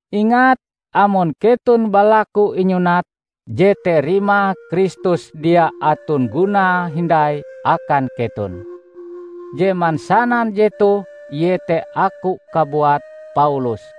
Ingat, amon keton balaku inyunat, jete rimae Kristus dia aton gunae hindai akan keton. Je mansanan jetoh iete aku kabuat, Paulus.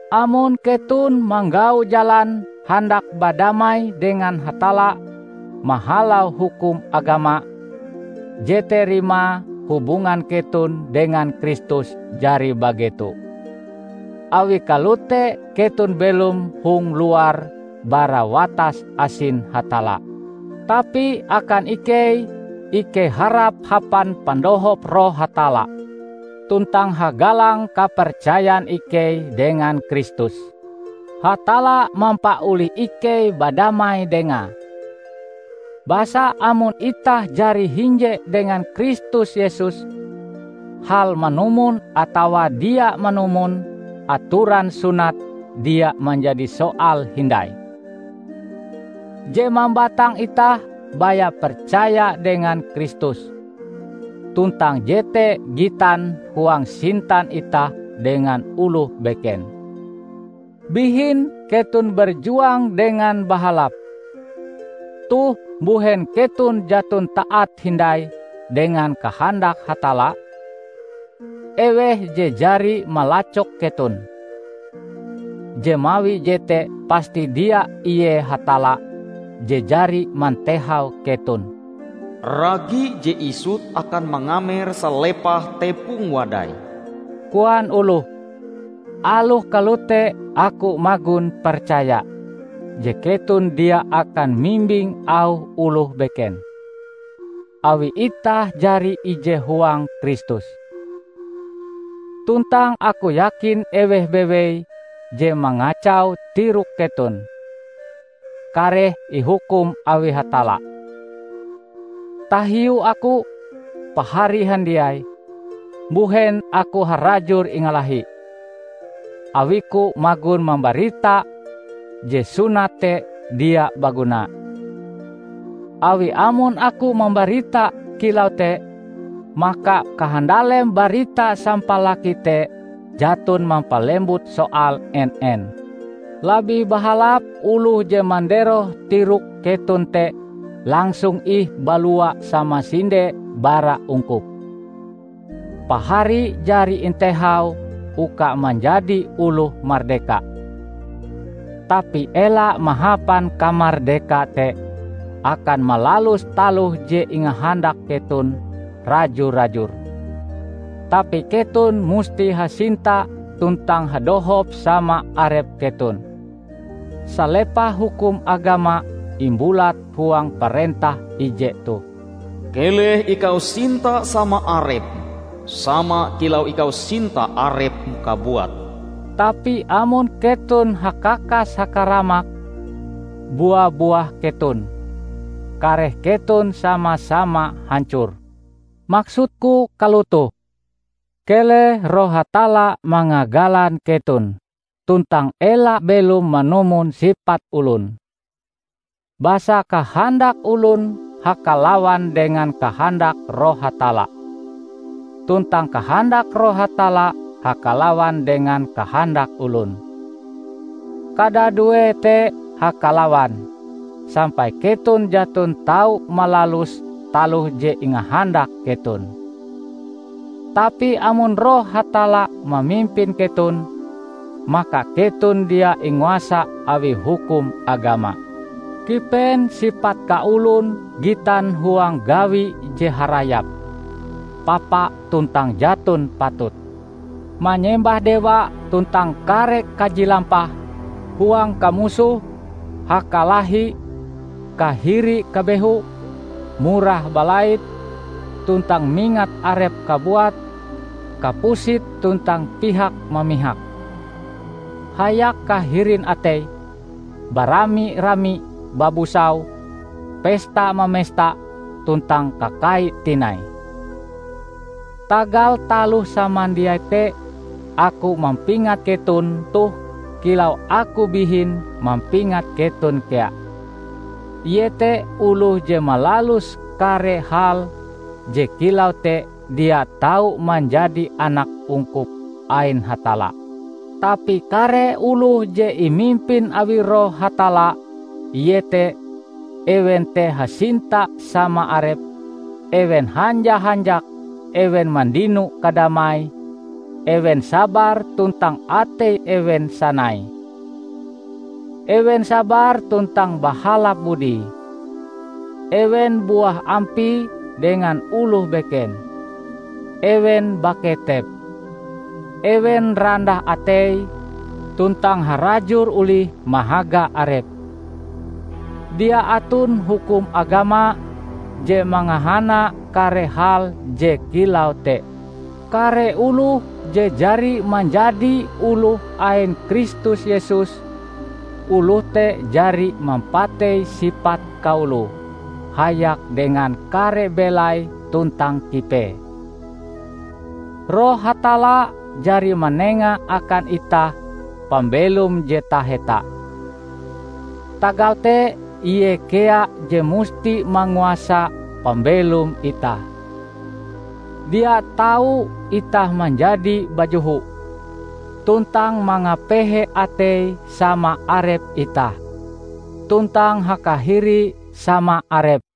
Amon keton manggau jalan handak badamai dengan Hatalla mahalau hukum agama, jete rimae hubungan keton dengan Kristus jari bageto. Awi kalote keton belom hong luar bara watas asin Hatalla. Tapi akan ikei, ikei harap hapan pandohop Roh Hatalla tuntang hagalang kapercayan ikei dengan Kristus, Hatalla mampaolih ikei badamai dengae. Basa amon itah jari hinje dengan Kristus Yesus, hal manumon atawa dia manumon atoran sunat dia manjadi soal hindai. Je mambatang itah baya percaya dengan Kristus, tuntang jete gitan huang sintan itah dengan oloh beken. Bihin keton berjuang dengan bahalap! Toh mbuhen keton jaton taat hindai dengan kahandak Hatalla? Eweh je jari malacok keton? Je mawi jete pasti dia ie Hatalla je jari mantehau keton! "Ragi je isut akan mangamer salepah tepong wadai," koan oloh. Aloh kalote aku magon percaya je keton dia akan mimbing auh oloh beken, awi itah jari ije huang Kristus. Tuntang aku yakin eweh bewei je mangacau tirok keton, kareh ihukum awi Hatalla. Tahiu aku, pahari handiai, mbuhen aku harajur ingalahi, awiku magon mambarita je sunat te dia baguna? Awi amon aku mambarita kilau te, maka kahandalem barita sampalaki te jaton mampalembut soal en-en. Labih bahalap oloh je manderoh tirok keton te langsung ih balua samasinde bara ungkup! Pahari jari intehau uka manjadi oloh mardeka. Tapi ela mahapan kamardeka te akan malalus taloh je ingahandak keton raju-rajur. Tapi keton musti hasinta tuntang hadohop sama arep keton. Salepah hukum agama imbulat huang parentah ije toh, "Keleh ikau sinta sama arepm sama kilau ikau sinta arepm kabuat." Tapi amon keton hakakas-hakaramak, bua-buah keton, kareh keton sama-sama hancor. Maksudku kalotoh: Keleh Roh Hatalla mangagalan keton tuntang ela belom manumon sipat olon. Basa kahandak olon hakalawan dengan kahandak Roh Hatalla, tuntang kahandak Roh Hatalla hakalawan dengan kahandak olon. Kadaduee te hakalawan, sampai keton jaton tau malalus taloh je ingahandak keton. Tapi amon Roh Hatalla mamimpin keton, maka keton dia inguasa awi hukum agama. Kipen sipat kaolon gitan huang gawi je harayap, papa tuntang jaton patut; manyembah dewa tuntang kare kaji lampah; huang kamusoh, hakalahi, kahiri-kabehu, murah balait, tuntang mingat arep kabuat; kapusit tuntang pihak-mamihak, hayak kahirin atei, barami-rami babusau, pesta-mamesta tuntang kakai tinai. Tagal taloh samandiai te aku mampingat keton toh kilau aku bihin mampingat keton kea, iete oloh je malalus kare hal je kilau te dia tau manjadi anak ungkup ain Hatalla. Tapi kare oloh je imimpin awi Roh Hatalla, iete: Ewen te hasinta sama arepe, ewen hanja-hanjak, ewen mandino kadamai, ewen sabar tuntang ateie ewen sanai, ewen sabar tuntang bahalap budie, ewen buah ampie dengan oloh beken, ewen baketep, ewen randah ateie, tuntang harajur olih mahaga arepe. Dia aton hukum agama je mangahana kare hal je kilau te. Kare oloh je jari manjadi oloh ain Kristus Yesus, oloh te jari mampatei sipat kaoloe hayak dengan kare belai tuntang kipee. Roh Hatalla jari manenga akan itah pambelom je taheta; tagal te Ie kea je musti manguasa pambelom itah. Dia tau itah manjadi bajoho, tuntang mangapehe atei sama arep itah, tuntang hakahiri sama arep.